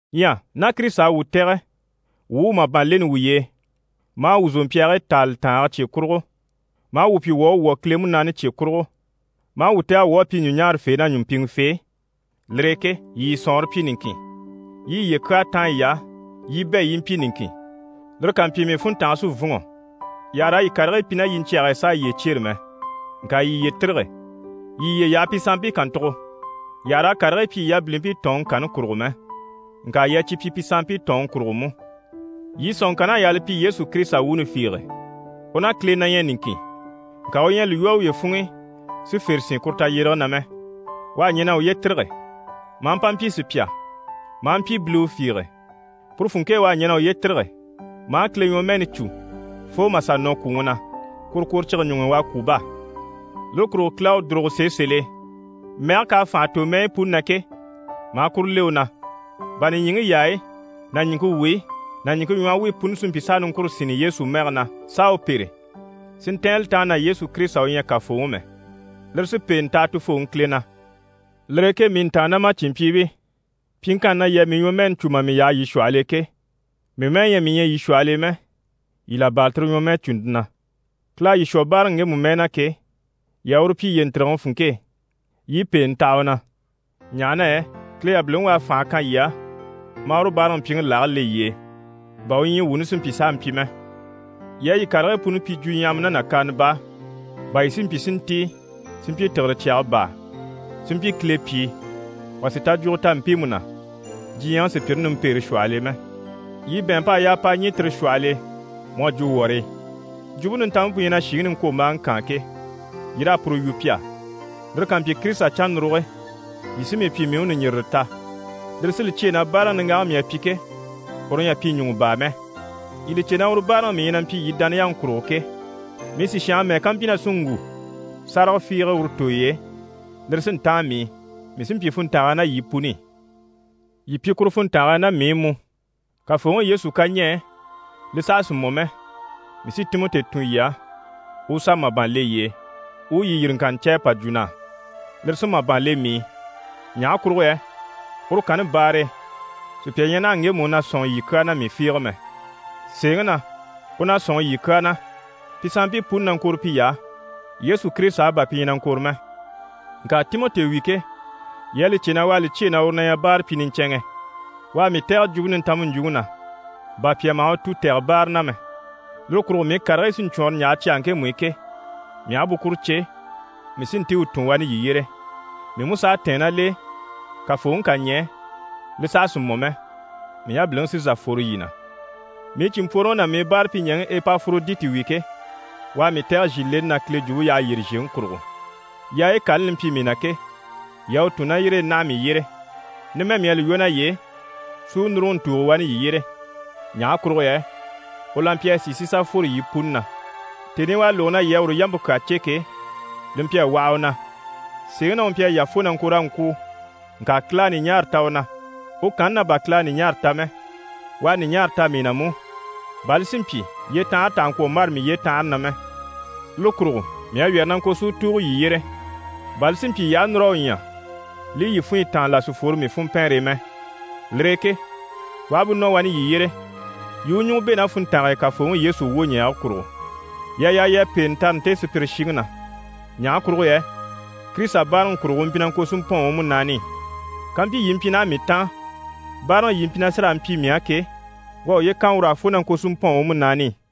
Ɲyɛ ná Kirisita à wuu tɛ̀gɛ wuu u màban leni wuye e, maa wuu zòmpyaagii taali tàange cye kurugo, maa wuu pyi wuu à wwɔ̀ Kile Munaani cye kurugo, maa wuu tɛ̀gɛ wuu à pyi ɲùɲaarafee ná ɲùmpiŋɛfee, lire e ke, yii yii sɔ̀nŋɔre pyi niŋkin, yii yiye kyaa táan yiy'á, yii bɛ̂ yii i mpyi niŋkin. Lire ká mpyi, mii funntange sí n‑fûnŋɔ. Yii àha raa yii karigii pyi ná yiɲcyɛge e s'a yiye cyêre mɛ, ŋka yii yiye tîrige, yii yiye yaha pi sanmpii kàntugo. Yii àha raa karigii pyi yii yabilimpii tɔ̀ɔnŋi kanni kurugo mɛ, ŋka yii a cyi pyi pi sanmpii tɔ̀ɔnŋi kurugo mú. Yii sɔ̀nŋɔŋkann'à yaa li pyi Yesu Kirisita wuuni fiige: U ná Kile na ɲyɛ niŋkin, ŋka u ɲyɛ a li lwɔ́ uye funŋ'i si fère sín kuru tayyérege na mɛ. U à ɲɛn'a uye tîrige, maa mpa mpyi sùpya, maa mpyi biliwe fiige. Puru funŋke e u à ɲɛn'a uye tîrige, maa Kile ɲwɔmɛɛni cû fo mà sà nɔ kwùŋi na, kworokworocige ɲuŋ'i u à kwû bá! Lire kurugo Kile à u dùrugo sèe sèl'e, mɛge k'à fànha tò mɛyi puni na ke, maa kuru le u na, bà nìɲyiŋi yaayi ná ɲìŋke wuyi ná ɲìŋke ɲwɔhɔ wuyi puni si mpyi s'a niŋkure sínni Yesu mɛge na s'a u pêre, si ntɛ̀ɛn li taan na Yesu Kirisita u ɲyɛ Kafooŋi mɛ. Lire sí pèente taha Tufooŋi Kile na. Lire e ke mii ntàannamacinmpyiibii, pyiŋkanni na yii à mii ɲwɔmɛɛni cû mà mii yaha yii shwɔhɔl'e ke, mii mɛ́ɛ ɲyɛ mii ɲyɛ yii shwɔhɔl'e mɛ, yii là bâra tire ɲwɔmɛɛcunte na. Kile à yii shwɔ báaraŋi ŋgemu mɛɛ na ke, yii a uru pyi yiye ntìrigeŋi funŋke e, yii i pèenɛ taha u na. Ɲaha na yɛ Kile yabiliŋi u à fànhe kan yii á maa uru báaraŋi mpyiŋi lage le yii e, bà u ɲyii wuuni si mpyi s'a mpyi mɛ. Yii a yii karigii puni pyi jwuɲyahama ná nàkaana baa, bà yii si mpyi si ntíi si mpyi tìgire cyaga baa, si mpyi Kile pyìi, wà sì tajwugo ta mpiimu na, diɲyɛŋi sùpyire nimpeere shwɔhɔl'e mɛ. Yii bɛ̀ɛnmp'à yaa p'a ɲî tire shwɔhɔl'e mu à jwo wɔrii. Jwumpe Nintanmpe pu ɲyɛ na shìŋi niŋkwombaaŋi kaan ke, yii raa puru yu pi á. Lire ká mpyi, Kirisita cannuruge, yii sí mii pyi mii u ɲùɲjirire ta. Lire sí li cyêe na báaraŋi niŋgaŋi mii à pyi ke, uru ɲyɛ a pyi ɲùŋɔ baa mɛ. Yii li cè na uru báaraŋi mii ɲyɛ na mpyi yii dániyaŋi kurugo ke, mii sìshange mɛ́ɛ ká mpyi na sí n‑wu sáraga fiige uru tooy'e, lire sí n‑táan mii i, mii sí n‑pyi funntange e ná yii puni i. Yii pyi kuru funntange e ná mii i mú. Kafooŋi Yesu ká ɲɛɛ, li saha sì mɔ mɛ, mii sí Timɔti tun yii á, u u sà màban le yii e, u u yii yìriŋkanni cè u pa jwo na á, lire sí màban le mii i. Ɲaha kurugo yɛ uru kanni baare e, sùpya ɲyɛ naha ŋgemu u na sɔ̂nŋi yii kyaa na mii fiige mɛ. Sèeŋi na, u na sɔ̂nŋi yii kyaa na. Pi sanmpii puni na ŋkɔ̀re piy'á. Yesu Kirisita á, bà pi ɲyɛ na ŋkɔ̀re mɛ. Ŋka Timɔti wi ke, yii à li cè na u à li cyêe na u na ɲyɛ báarapyi niɲcɛnŋɛ. U à mii tɛ̀gɛ Jwumpe Nintanmpe ɲjwuŋi na, bà pyà maha u tu tɛ̀gɛ báara na mɛ. Lire kurugo mii karigii sí n‑cwɔɔnrɔ n‑yaha cyage ŋkemu i ke, mii aha bú kuru cè, mii sí n‑tíi u tun wani yii yyére. Mii mú s'à tɛ̀ɛn ná l'e, Kafooŋi ká ɲɛɛ, li saha sì mɔ mɛ, mii yabiliŋi sí n‑sà n‑fworo yii na. Mii cìnmpworoŋi ná mii báarapyiɲɛɛŋi Epaforoditi wi ke, u à mii tɛ̀gɛ zhìleni na Kile Jwumpe yyaha yyére zhèŋi kurugo. Yaayi kani li mpyi mii na ke, yii à u tun ná yire e naha mii yyére. Numɛ mii à li lwɔ́ naye e si u núruŋɔ ntùugo wani yii yyére. Ɲaha kurugo yɛ u la mpyi a sìi si sà fworo yii puni na. Tèni i u à lógo na yii à uru yampe kyaa cè ke, li mpyi a waha u na. Sèeŋi na, u mpyi a yà fo na ŋko raa ŋkwûu. Ŋka Kile à ɲùɲaara ta u na. U kanni na bà Kile à ɲùɲaare ta mɛ, u à ɲùɲaara ta mii na mú, bà li si mpyi yyetanhare tà hà ŋkwɔ̀ mbâra mii yyetanhare na mɛ. Lire kurugo mii à wyɛ̀rɛ na ŋko si u tùugo yii yyére, bà li si mpyi yii aha núr'a u ɲya, li i yii funɲyi táan, là si fworo mii funmpɛɛnre e mɛ. Lire e ke u aha bú nɔ wani yii yyére, yii i u ɲùŋɔ bɛ̂ ná funntange e Kafooŋi Yesu wwoɲɛɛge kurugo. Yii à yaa yii a pèente tare nte sùpyire shiŋi na. Ɲaha kurugo yɛ Kirisita báaraŋi kurugo, u mpyi na ŋko si mpɔ̂ɔn u múnaani i. Kàmpyi yii mpyi naha mii taan, báaraŋi yii mpyi na sí raa mpyi mii á ke, u à uye kan ur'á fo na ŋko si mpɔ̂ɔn u múnaani i.